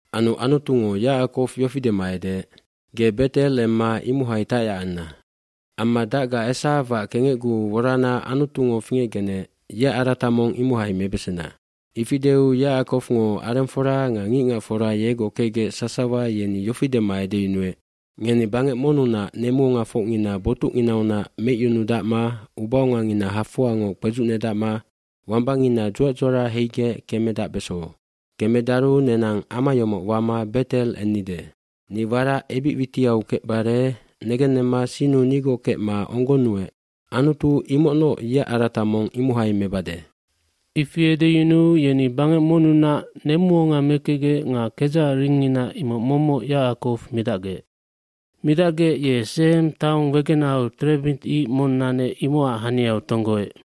aAnu Anutungo Yacakow yofi dema edeec, “Ge Bet El emma imohai tacyac anna. Amma dacga Esawac kengecguu worana Anutungo fingecgenec yeac arata mong imohai mebesena.” bIfi deu Yacakowngo arengfora nga ngicngacfora yegoc kecgec sasawa yeni yofi dema edeyunuec, “Ngeni bangec monnunac nemuongafocngina botucnginaunac meicyunudacma ubaongangina hafoangoc kpedzucnedacma wambangina dzuac dzuara heigec kemedacbeso. cKemedaru nenang ama yomoc wama Bet El ennide. Ni warac ebic witiau kecbare negennemma sinnu nigoc kecma onggonnuec Anutu imocnoc yeac arata mong imohai mebade.” dIfi edeyunuu yeni bangec monnunac nemuonga mekecgec nga kedzacac ringngina imoc momoc Yacakow midacgec. Midacgec ye Sehem taong wegenahau terebint ic mong nanec imocac haniau tonggoec.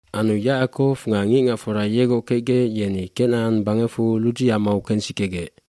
gAnu Yacakow nga ngicngacfora yegoc kecgec yeni Kenacan bangecfu Ludzif amau kensikegec.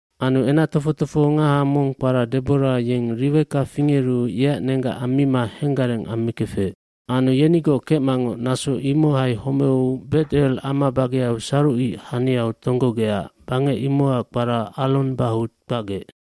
kAnu enac tofoc tofohongaha mong kpara Debora yeng Riweka fingeru yeac nenggac ammima henggareng ammikefec. Anu yenigoc kecmangoc naso imohai homeu Bet El ama bageau sarucic haniau tonggogecac bangec imocac kpara Allon Bahutj kpacgec.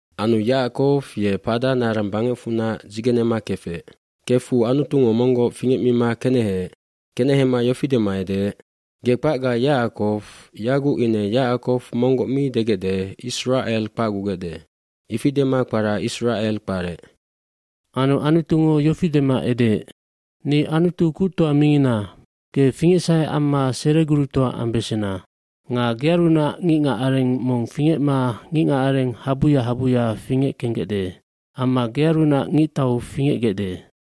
lAnu Yacakow ye Paddan Aram bangecfunac dzigenema kefec. Kefu Anutungo monggoc fingecmima keneheec. mKenehema yofi dema edeec, “Ge kpacga Yacakow, yaguc ine Yacakow monggoc mi degecde Isracel kpacgugecde.” Ifi dema kpara Isracel kparec. nAnu Anutungo yofi dema edeec, “Ni Anutu Kuctoa mingina. Ge fingecsahe amma seregurutoa ambesena. Nga gearunac ngicngacareng mong fingecma ngicngacareng habuya habuya fingeckenggecde. Amma gearunac ngictau fingecbesandae.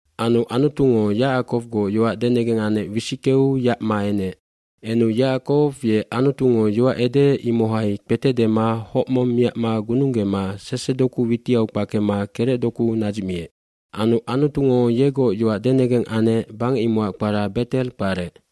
Anu Anutungo Yacakowgoc yoac denegeng anec wisickeu yacma enec. oEnu Yacakow ye Anutungo yoac edeec imohai kpete dema hoc mong miacma gununggeu nanu sesedoku witiau kpakema kerecdoku nadzicmiec. pAnu Anutungo yegoc yoac denegeng anec bangec imocac kpara Bet El kparec.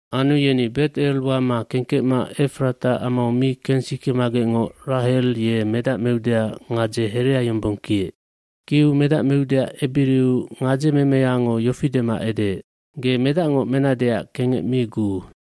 Anu yeni Bet El wama kengkecma Efrata amau mi kensikemagecngoc Rahel ye medac meudeac gadze herea yombong kiec. Kiu medac meudeac ebiriu gadzememeyango yofi dema edeec, “Ge medacngoc menadeac kengec mi guu.”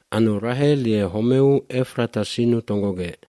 Anu Rahel ye homeec. Homeu Efrata sinnu tonggogec.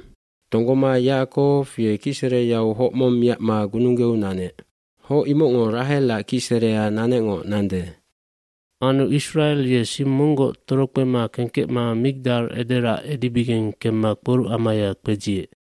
tonggoma Yacakow ye kicsereyau hoc mong miacma gununggeu nanec. Hoc imocngo Rahelac kicserea nanecngoc nande. Anu Isracel ye sing monggoc torokpema kengkecma Migdal Ederacs edibigeng kemma kporucamaya kpedziec.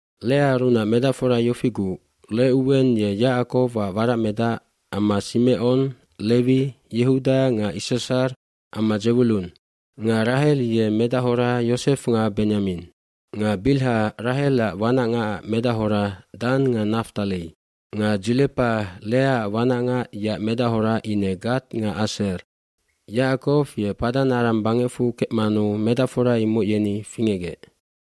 uLeaarunac medacfora yofiguc Recuwen ye Yacakowac waracmedac amma Simecon, Lewi, Yehuda nga Issashar amma Dzewulun. vNga Rahel ye medachora Yosef nga Benyamin. wNga Bilha, Rahelac wanacngacac medachora Dan nga Naftali. xNga Dzilepa, Leaac wanacngac yeac medachora ine Gad nga Aser. Yacakow ye Paddan Aram bangecfu kecmanu medacfora imoc yeni fingecgec.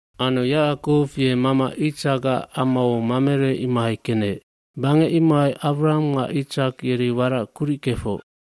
zAnu Yacakow ye mama Itsakac amau Mamerey imohai kenec. Bangec imohai Awraham nga Itsak yeri warac kuric kefoc.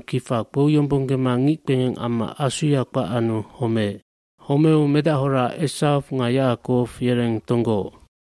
kifa kpouyombonggema ngickpengeng amma asuya kpac anu homeec. Homeu medachora Esaw nga Yacakow yereng tonggooc.